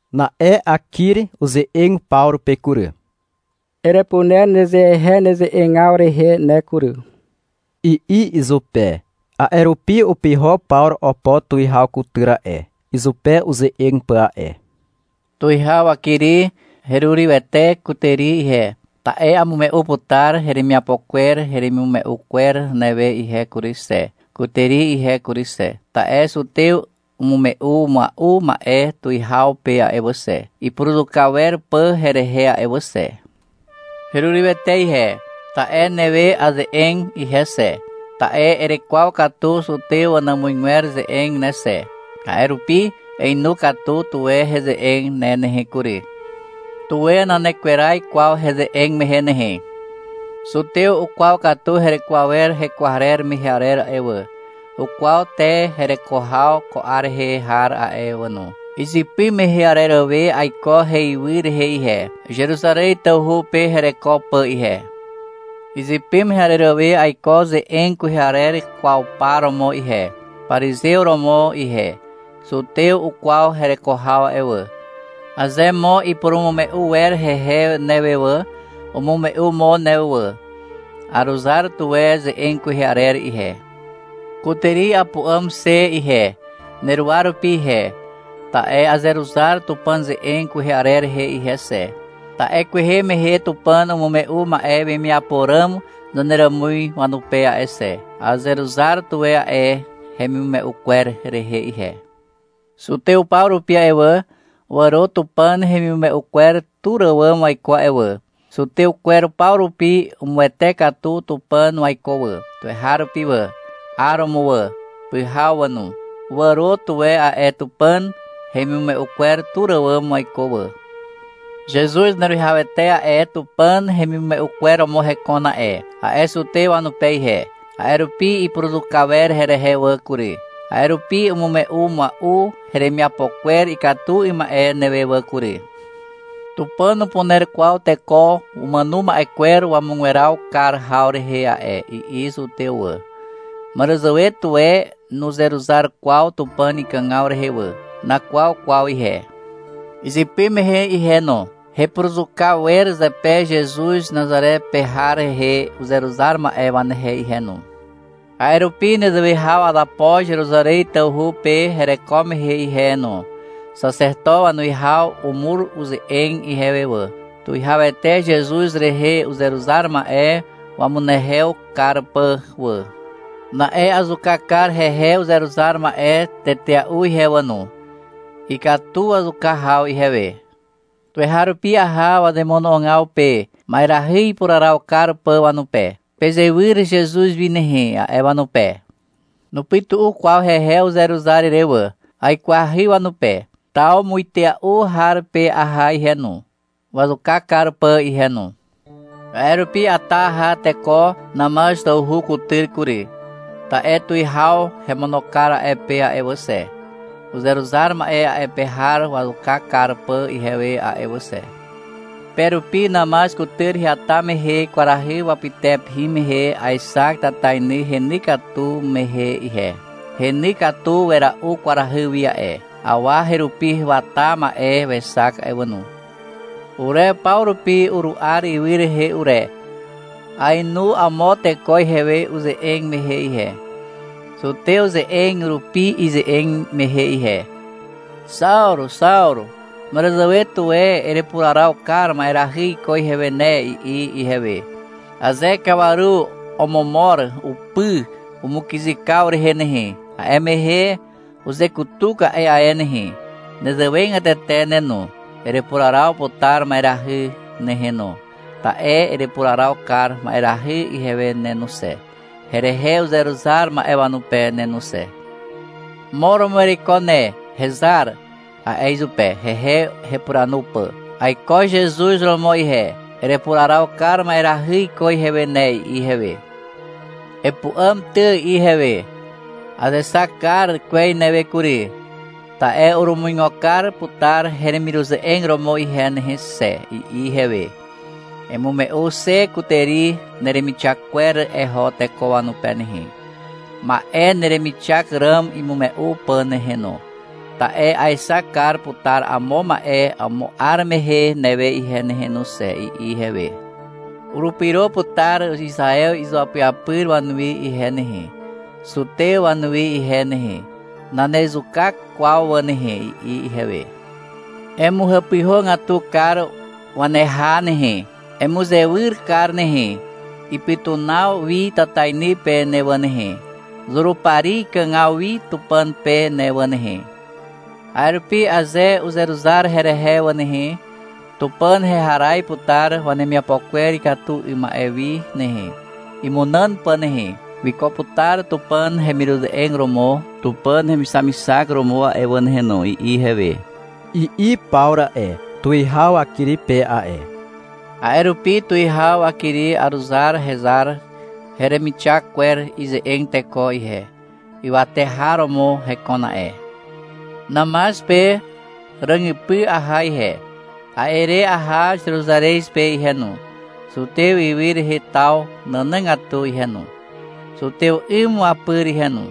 Na'e Akiri uze'eg Pawru pe kury. -Erepuner nezehe neze'egaw rehe ne kury, i'i izupe. A'e rupi upyho Pawru opo tuwihaw kutyr a'e, izupe uze'eg pà a'e. — Tuwihaw Akiri. Herurywete kutàri ihe, ta'e amume'u putar heremiapo kwer heremimume'u kwer newe ihe kury xe, kutàri ihe kury xe. Ta'e zutew umume'u mua'u ma'e tuwihaw pe a'e wà xe, ipuruzuka wer pà herehe a'e wà xe. Herurywete ihe, ta'e newe aze'eg ihe xe, ta'e erekwaw katu zutew wanàmuzgwer ze'eg ne xe. A'e rupi einu katu tuwe heze'eg ne nehe kury. Tuwe nanekweraz kwaw heze'eg mehe nehe. Zutew ukwaw katu hereko awer hekwarer mehe arer a'e wà, ukwaw te hereko haw ko 'ar rehe har a'e wà no. Izypy mehe arer we aiko heywy rehe ihe, Zeruzarez tawhu pe hereko pà ihe. Izypy mehe arer we aiko ze'eg kwehe arer kwaw par romo ihe, parizew romo ihe. Zutew ukwaw hereko haw a'e wà. Aze mo ipurumume'u wer hehe newe wà, umume'u mo newe wà. Aruzar tuwe ze'eg kwehe arer ihe. Kutàri apu'àm xe ihe, neruwa rupi ihe, ta'e azeruzar Tupàn ze'eg kwehe arer rehe ihe xe. Ta'e kwehe mehe Tupàn umume'u ma'e wemiapo ràm zaneràmuz wanupe a'e xe. Azeruzar tuwe a'e hemimume'u kwer rehe ihe. Zutew paw rupi a'e wà, wàro Tupàn hemimume'u kwer tur àwàm waiko a'e wà. Zutew kwer paw rupi umuwete katu Tupàn waiko wà, tuweharupi wà, 'aromo wà, pyhaw wà no. Wàro tuwe a'e Tupàn hemimume'u kwer tur àwàm waiko wà. — Zezuz Zaneruwihawete a'e Tupàn hemimume'u kwer romo hekon a'e, a'e zutew wanupe ihe. A'e rupi ipuruzuka wer herehe wà kury. A'e rupi umume'u mua'u heremiapo kwer ikatu 'ym ma'e newe wà kury. — Tupàn nupuner kwaw teko umàno ma'e kwer wamugweraw kar haw rehe a'e, i'i zutew wà. Màràzàwe tuwe nuzeruzar kwaw Tupàn ikàgaw rehe wà. Nakwaw kwaw ihe. Izypy mehe ihe no, hepuruzuka wer zepe Zezuz Nazare pe har rehe uzeruzar ma'e wanehe ihe no. A'e rupi nezewe haw azapo Zeruzarez tawhu pe hereko mehe ihe no. Xaxeto wanuwihaw umur uze'eg ihewe wà, Tuwihawete Zezuz rehe uzeruzar ma'e wamunehew kar pà wà. Na'e azuka kar hehe uzeruzar ma'e tetea'u ihe wà no. Ikatu wazuka haw ihewe. Tuweharupi aha wazemono'ogaw pe, ma'erahy ipuraraw kar pà wanupe. — Pezewyr Zezuz wi nehe, a'e wanupe. Nupytu'u kwaw hehe uzeruzar ire wà. Aikwahy wanupe. Taw muitea'u har pe aha ihe no, wazuka kar pà ihe no. — A'e rupi ata aha teko Namaz tawhu kutyr kury. Ta'e tuwihaw hemono kar a'e pe a'e wà xe, uzeruzar ma'e a'e pe har wazuka kar pà ihewe a'e wà xe. Pe rupi Namaz kutyr heata mehe kwarahy wapytepe hin mehe aexak tatainy heny katu mehe ihe. Heny katu wera'u kwarahy wi a'e. Awa herupi wata ma'e wexak a'e wà no. Ure paw rupi uru'ar ywy rehe ure. Aenu amo teko ihewe uze'eg mehe ihe, zutew ze'eg rupi ize'eg mehe ihe. — Xawru, Xawru, màràzàwe tuwe erepuraraw kar ma'erahy iko ihewe ne, i'i ihewe. Aze kawaru omomor upy umukyzykaw rehe nehe, a'e mehe uzekutuk a'e ae nehe. Nezewegatete ne no, erepuraraw putar ma'erahy nehe no, ta'e erepuraraw kar ma'erahy ihewe ne no xe, herehe uzeruzar ma'e wanupe ne no xe. — Mo romo ereiko ne, hezar, a'e izupe, hehe hepuranu pà. — Aiko Zezuz romo ihe, erepuraraw kar ma'erahy iko ihewe ne, i'i ihewe. — Epu'àm ty, i'i ihewe. — Azexak kar kwez newe kury, ta'e urumuigo kar putar heremiruze'eg romo ihe nehe xe, i'i ihewe. — Emume'u xe kutàri neremixak kwer eho teko wanupe nehe, ma'e neremixak ràm imume'u pà nehe no, ta'e aexak kar putar amo ma'e amo 'ar mehe newe ihe nehe no xe, i'i ihewe. — Urupyro putar Izaew izuapyapyr wanuwi ihe nehe, zutew wanuwi ihe nehe. Nanezuka kwaw wà nehe, i'i ihewe. — Emuhàpyhàgatu kar waneha nehe. Emuzewyr kar nehe, ipytunaw wi tatainy pe ne wà nehe, Zurupari ikàgaw wi Tupàn pe ne wà nehe. A'e rupi aze uzeruzar herehe wà nehe, Tupàn heharaz putar wanemiapo kwer ikatu 'ym ma'e wi nehe, imunàn pà nehe. Wiko putar Tupàn hemiruze'eg romo Tupàn hemixamixak romo a'e wà nehe no, i'i ihewe, i'i Pawru a'e, tuwihaw Akiri pe a'e. — A'e rupi, tuwihaw Akiri, aruzar hezar heremixak kwer ize'eg teko ihe. Ywate har romo hekon a'e. Namaz pe ràgypy aha ihe. A'e re aha Zeruzarez pe ihe no, zutew ywy rehe taw nànàgatu ihe no, zutew 'ym wapyr ihe no.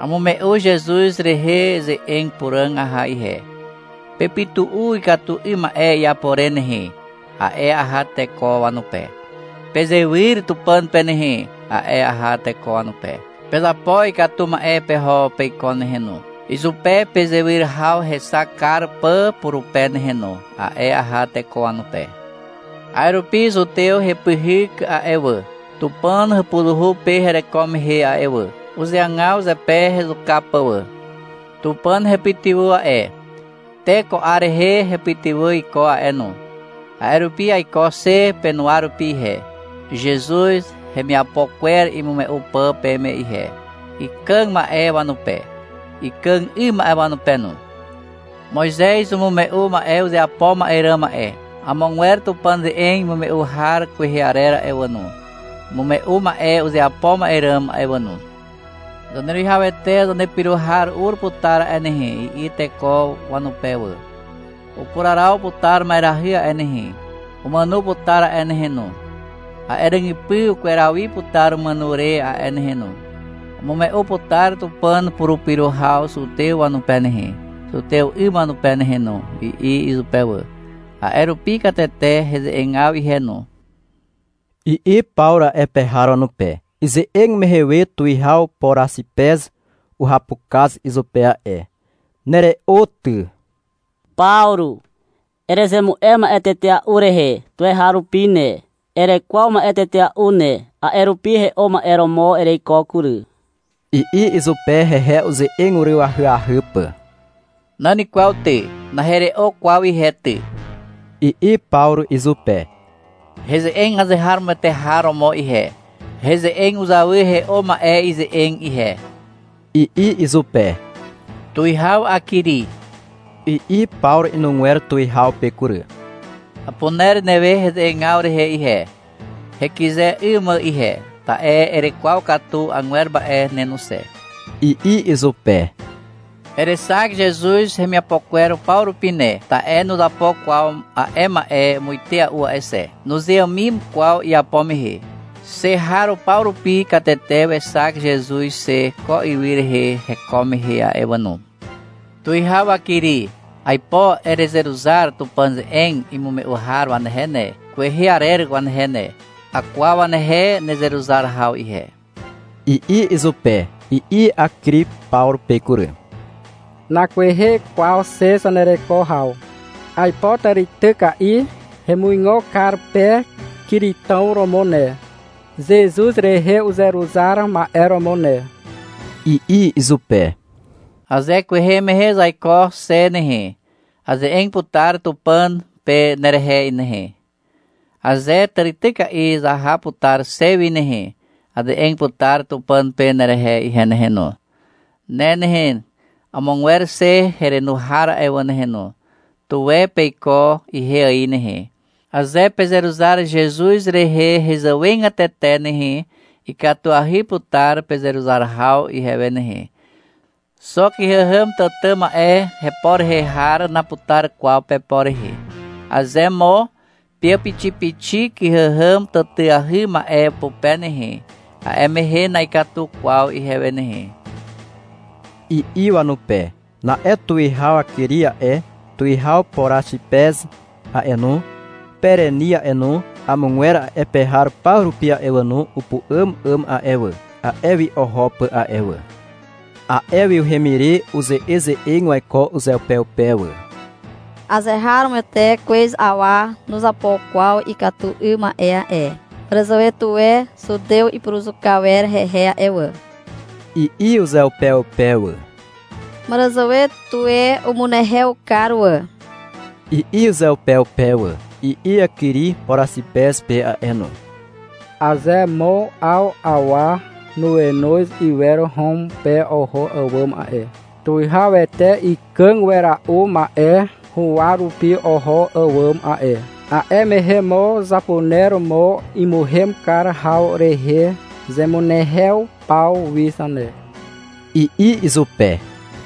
Amume'u Zezuz rehe ze'eg puràg aha ihe. — Pepytu'u ikatu 'ym ma'e iapo re nehe, a'e aha teko wanupe. — Pezewyr Tupàn pe nehe, a'e aha teko wanupe. — Pezapo ikatu ma'e peho peiko nehe no, izupe pezewyr haw hexak kar pà purupe nehe no, a'e aha teko wanupe. A'e rupi zutew hepyhyk a'e wà, Tupàn hàpuzuhu pe hereko mehe a'e wà. Uzeagaw zepe hezuka pà wà. Tupàn hepytywà a'e. Te ko 'ar rehe hepytywà iko a'e no. A'e rupi aiko xe penuwa rupi ihe, Zezuz hemiapo kwer imume'u pà peme ihe, ikàg ma'e wanupe, ikàg 'ym ma'e wanupe no. Moizez umume'u ma'e uzeapo ma'e ràm a'e. Amogwer Tupàn ze'eg imume'u har kwehe arer a'e wà no, umume'u ma'e uzeapo ma'e ràm a'e wà no. — Zaneruwihawete zanepyro har ur putar a'e nehe, i'i teko wanupe wà. — Upuraraw putar ma'erahy a'e nehe. Umàno putar a'e nehe no. A'e ràgypy ukweraw wi putar umàno re a'e nehe no. Umume'u putar Tupàn purupyro haw zutew wanupe nehe, zutew 'ym wanupe nehe no, i'i izupe wà. — A'e rupi katete heze'egaw ihe no, i'i Pawru a'e pe har wanupe. Ize'eg mehe we tuwihaw Poraxipez uhapukaz izupe a'e. — Nere'o ty, Pawru. Erezemu'e ma'e tetea'u rehe tuweharupi ne, erekwaw ma'e tetea'u ne, a'e rupi he'o ma'e romo ereiko kury, i'i izupe, hehe uze'eg uryw ahyahy pà. — Nan kwaw ty. Nahere'o kwaw ihe ty, i'i Pawru izupe. — Heze'eg azeharomoete har romo ihe. Heze'eg uzawy he'o ma'e ze'eg ihe, i'i izupe. — Tuwihaw Akiri, i'i Pawru inugwer tuwihaw pe kury. — Apuner newe heze'egaw rehe ihe, hekyze 'ym mà ihe, ta'e erekwaw katu agwer ma'e ne no xe, i'i izupe. — Erexak Zezuz hemiapo kwer paw rupi ne, ta'e nuzapo kwaw a'e ma'e muitea'u a'e xe. Nuzeàmim kwaw iapo mehe. Xe har paw rupi katete wexak Zezuz xe ko ywy rehe heko mehe a'e wà no. Tuwihaw Akiri. Aipo erezeruzar Tupàn ze'eg imume'u har wanehe ne, kwehe arer wanehe ne. Akwaw wanehe nezeruzar haw ihe, i'i izupe. I'i Akiri Pawru pe kury. — Nakwehe kwaw xe zanereko haw. Aipo tàrityka'i hemuigo kar pe kiritàw romo ne, Zezuz rehe uzeruzar ma'e romo ne, i'i izupe. — Aze kwehe zaiko xe nehe, aze'eg putar Tupàn pe nerehe nehe. Aze tàrityka'i zaha putar xe wi nehe, aze'eg putar Tupàn pe nerehe ihe nehe no. Ne nehe, amogwer xe herenu har a'e wà nehe no, tuwe peiko ihe ài nehe. Aze pezeruzar Zezuz rehe hezàwegatete nehe, ikatuahy putar pezeruzar haw ihewe nehe. Xo kyhàhàm tàtà ma'e hepo rehe har naputar kwaw pepo rehe. Aze amo peàpixipixi kyhàhàm tàtàahy ma'e pupe nehe, a'e mehe na'ikatu kwaw ihewe nehe, i'i wanupe. Na'e tuwihaw Akiri a'e, tuwihaw Poraxipez a'e no, Pereni a'e no, amogwer a'e pe har paw rupi a'e wà no, upu'àm 'àm a'e wà, a'e wi oho pà a'e wà. A'e wi uhem ire uze'eze'eg waiko uzeupeupe wà. — Azeharomoete kwez awa nuzapo kwaw ikatu 'ym ma'e a'e. Màràzàwe tuwe zutew ipuruzuka wer hehe a'e wà, i'i uzeupeupe wà. — Màràzàwe tuwe umunehew kar wà, i'i uzeupeupe wà. I'i Akiri Poraxipez pe a'e no. — Aze mo 'aw awa nuenoz iwer Hom pe oho àwàm a'e, tuwihawete ikàg wera'u ma'e huwa rupi oho àwàm a'e, a'e mehe mo zapuner mo imuhem kar haw rehe zemunehew paw wi zane, i'i izupe.